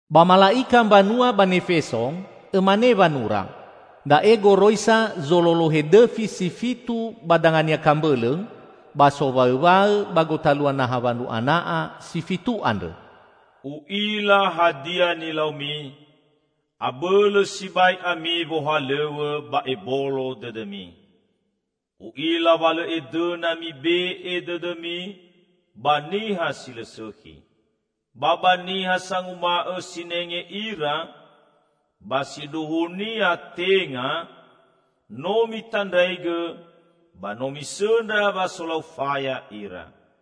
"Ba mala'ika mbanua ba Nefeso, õmane wanura: Da'e goroisa zololohe dõfi si fitu ba danga-Nia kambõlõ, ba sowaõwaõ ba gotalua naha wandru ana'a si fitu andrõ. U'ila hadia nilaumi; abõlõ sibai ami wohalõw̃õ ba ebolo dõdõmi. U'ila wa lõ edõna mibe'e dõdõmi ba niha si lõ sõkhi. Ba ba niha sanguma'õ sinenge ira, ba sindruhunia tenga, no mitandraigõ, ba no misõndra wa solau faya ira.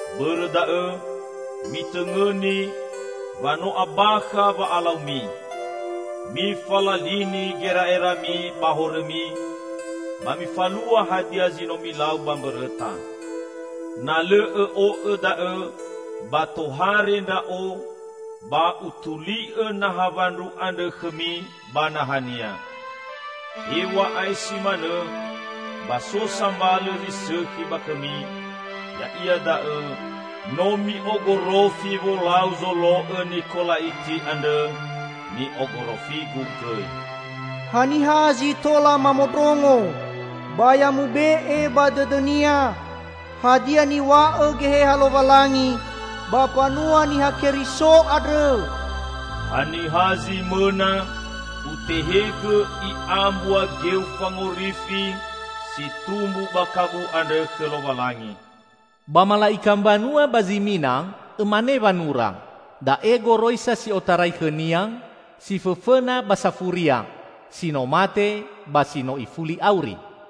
Bõrõ da'õ, mitõngõni wa no abakha wa'alaumi! Mifalalini gera'erami ba horõmi, ba mifalua hadia zi no milau ba mbõrõta. Na lõ õ'o'õ da'õ, ba tohare Ndra'o, ba utuli'õ naha wandru andrõ khõmi ba nahania. Hew̃a'ae si manõ, ba so sambalõ zi sõkhi ba khõmi; ya'ia da'õ: No mi'ogorofi wolau zolo'õ Nikola'iti andrõ, ni'ogorofi-Gu gõi. Haniha zi tola mamondrongo, ba ya mube'e ba dõdõnia hadia niw̃a'õ Geheha Lowalangi ba mbanua Niha Keriso andrõ! Haniha zi mõna, Utehegõ i'a mbua geu fangorifi, si tumbu ba Kabu andrõ khõ Lowalangi." "Ba mala'ika mbanua ba Zimina, õmane wanura: Da'e goroisa si otarai khõ-Nia, si fõfõna ba safuria -- si no mate ba si no ifuli auri.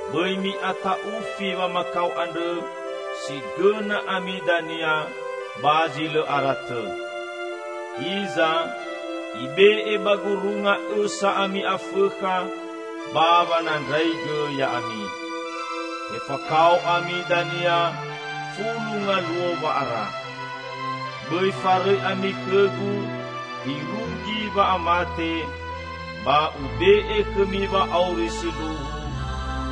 Bõi mi'ata'ufi wamakao andrõ si gõna ami dania ba zi lõ ara tõ. Hiza, ibe'e ba gurunga õsa ami Afõkha ba wanandraigõ ya'ami. Tefakao ami dania fulu ngaluo wa'ara. Bõi farõi ami khõ-Gu irugi wa'amate, ba Ube'e khõmi wa'auri sindruhu,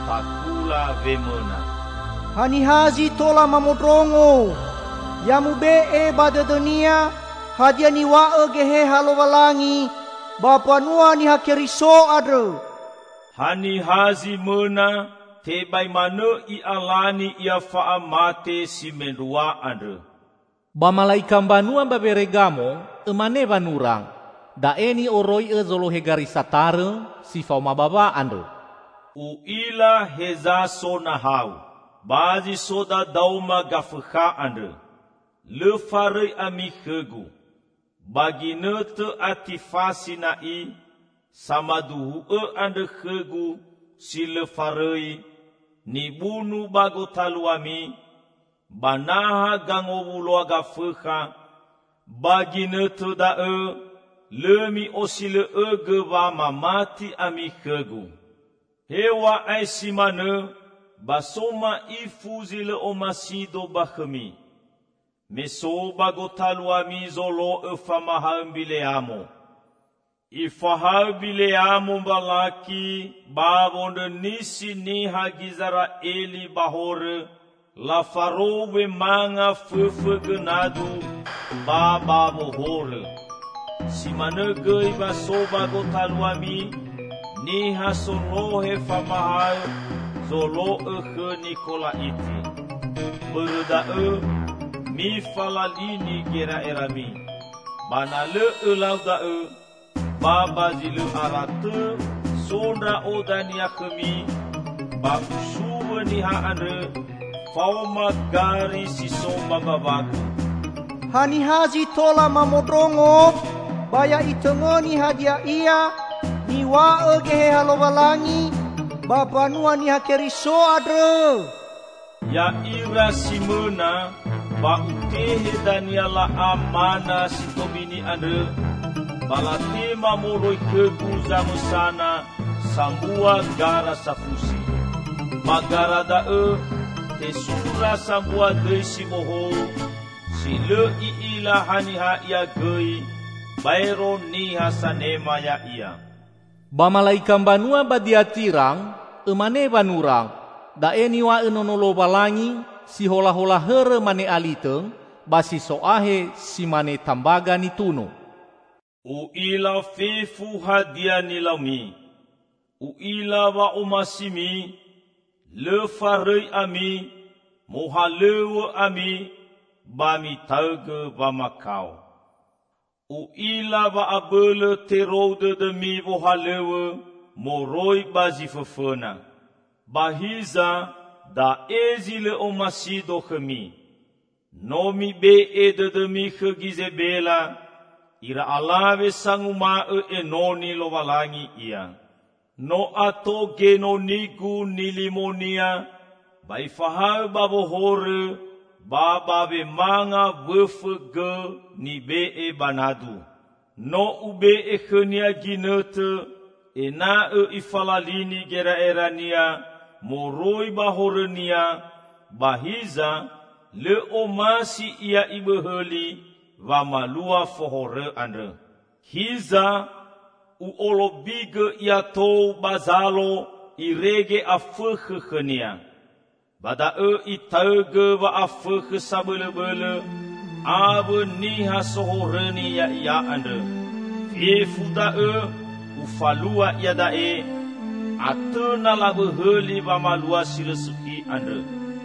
takula wemõna. Haniha zi tola mamondrongo, ya mube'e ba dõdõnia hadia niw̃a'õ Geheha Lowalangi ba mbanua Niha Keriso andrõ! Haniha zi mõna, tebai manõ i'alani ia fa'amate si mendrua andrõ." "Ba mala'ika mbanua ba Weregamo, õmane wanura: Da'e ni'oroi'õ zolohe gari satarõ si faoma bawa andrõ. U'ila heza so nahau. Ba zi so dadaoma Gafõkha andrõ. Lõ farõi ami khõ-Gu. Ba ginõtõ Atifasi na'i, samaduhu'õ andrõ khõ-Gu si lõ farõi, nibunu ba gotaluami, ba naha gangowuloa Gafõkha, ba ginõtõ da'õ lõ mi'osilõ'õgõ wa mamati ami khõ-Gu. Hew̃a'ae si manõ ba so ma'ifu zi lõ omasi-Do ba khõmi: Me so ba gotaluami zolo'õ famahaõ Mbileamo. Ifahaõ Bileamo Mbalaki ba wondrõnisi niha Gizera'eli ba horõ; lafarou wemanga fõfõ gõ nadu ba ba wohorõ. Si manõ gõi wa so ba gotaluami niha solohe famahaõ zolo'õ khõ Nikola'iti. Bõrõ da'õ, mifalalini gera'erami! Ba na lõ õlau da'õ, ba ba zi lõ ara tõ so Ndra'o dania khõmi ba Usuwõ niha andrõ faoma gari si so ba mbawa-Gu. Haniha zi tola mamondrongo, ba ya itõngõni hadia ia niw̃a'õ Geheha Lowalangi ba mbanua Niha Keriso andrõ! Ya'ira si mõna, ba Utehegõ dania la'a mana si tobini andrõ, ba latema moroi khõ-Gu zamõsana sambua gara safusi. Ba gara da'õ tesura sambua dõi si bohou, si lõ i'ila haniha ia gõi, baero niha sanema ya'ia." "Ba mala'ika mbanua ba Diatira, õmane wanura: Da'e niw̃a'õ Nono Lowalangi, si holahola hõrõ mane alitõ, ba si so ahe si mane tambaga nitunu. U'ila fefu hadia nilaumi -- U'ila wa'omasimi -- lõ farõi ami, mohalõw̃õ ami, ba mitaõgõ wamakao. U'ila wa abõlõ terou dõdõmi wohalõw̃õ moroi ba zi fõfõna. Ba hiza, da'e zi lõ omasi-Do khõmi: No mibe'e dõdõmi khõ Gizebela, ira alawe sanguma'õ enoni Lowalangi ia. No ato genoni-Gu nilimonia ba ifahaõ ba wohorõ ba ba wemanga wõfõ gõ nibe'e ba nadu. No Ube'e khõnia ginõtõ ena'õ ifalalini gera'erania moroi ba horõnia, ba hiza lõ omasi ia ibõhõli wamalua fohorõ andrõ. Hiza! U'olobigõ ia tou ba zalo irege afõkhõ khõnia. Ba daõ itaõgõ wa'afõkhõ sabõlõbõlõ awõ niha sohorõni ya'ia andrõ. Fefu da'õ Ufalua iada'e, atõ na labõhõli wamalua si lõ sõkhi andrõ.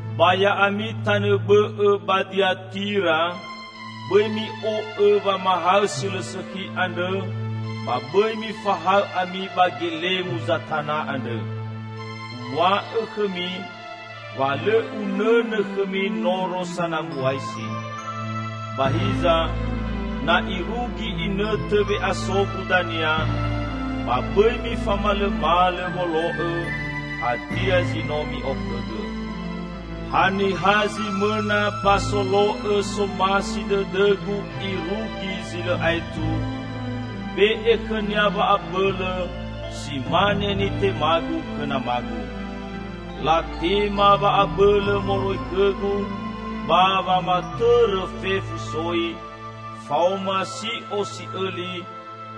Ba ya'ami tanõ bõ'õ ba Diatira, bõi mi'o'õ wamahaõ si lõ sõkhi andrõ, ba bõi mifahaõ ami ba gelemu Zatana andrõ. Uw̃a'õ khõmi wa lõ Unõnõ khõmi noro sanambuasi. Ba hiza, na irugi inõtõ we'aso-Gu dania, ba bõi mifamalõmalõ wolo'õ hadia zi no mi'okhõgõ. Haniha zi mõna, ba solo'õ somasi dõdõ-Gu irugi zi lõ aetu, Ube'e khõnia wa'abõlõ si mane nitema-Gu khõ Nama-Gu. Latema wa'abõlõ moroi khõ-Gu ba wamatõrõ fefu soi, faoma si'o si'õli,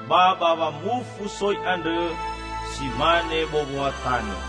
ba ba wamufu soi andrõ si mane bowoa tanõ.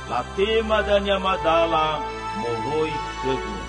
Latema dania madala moroi khõ-Gu.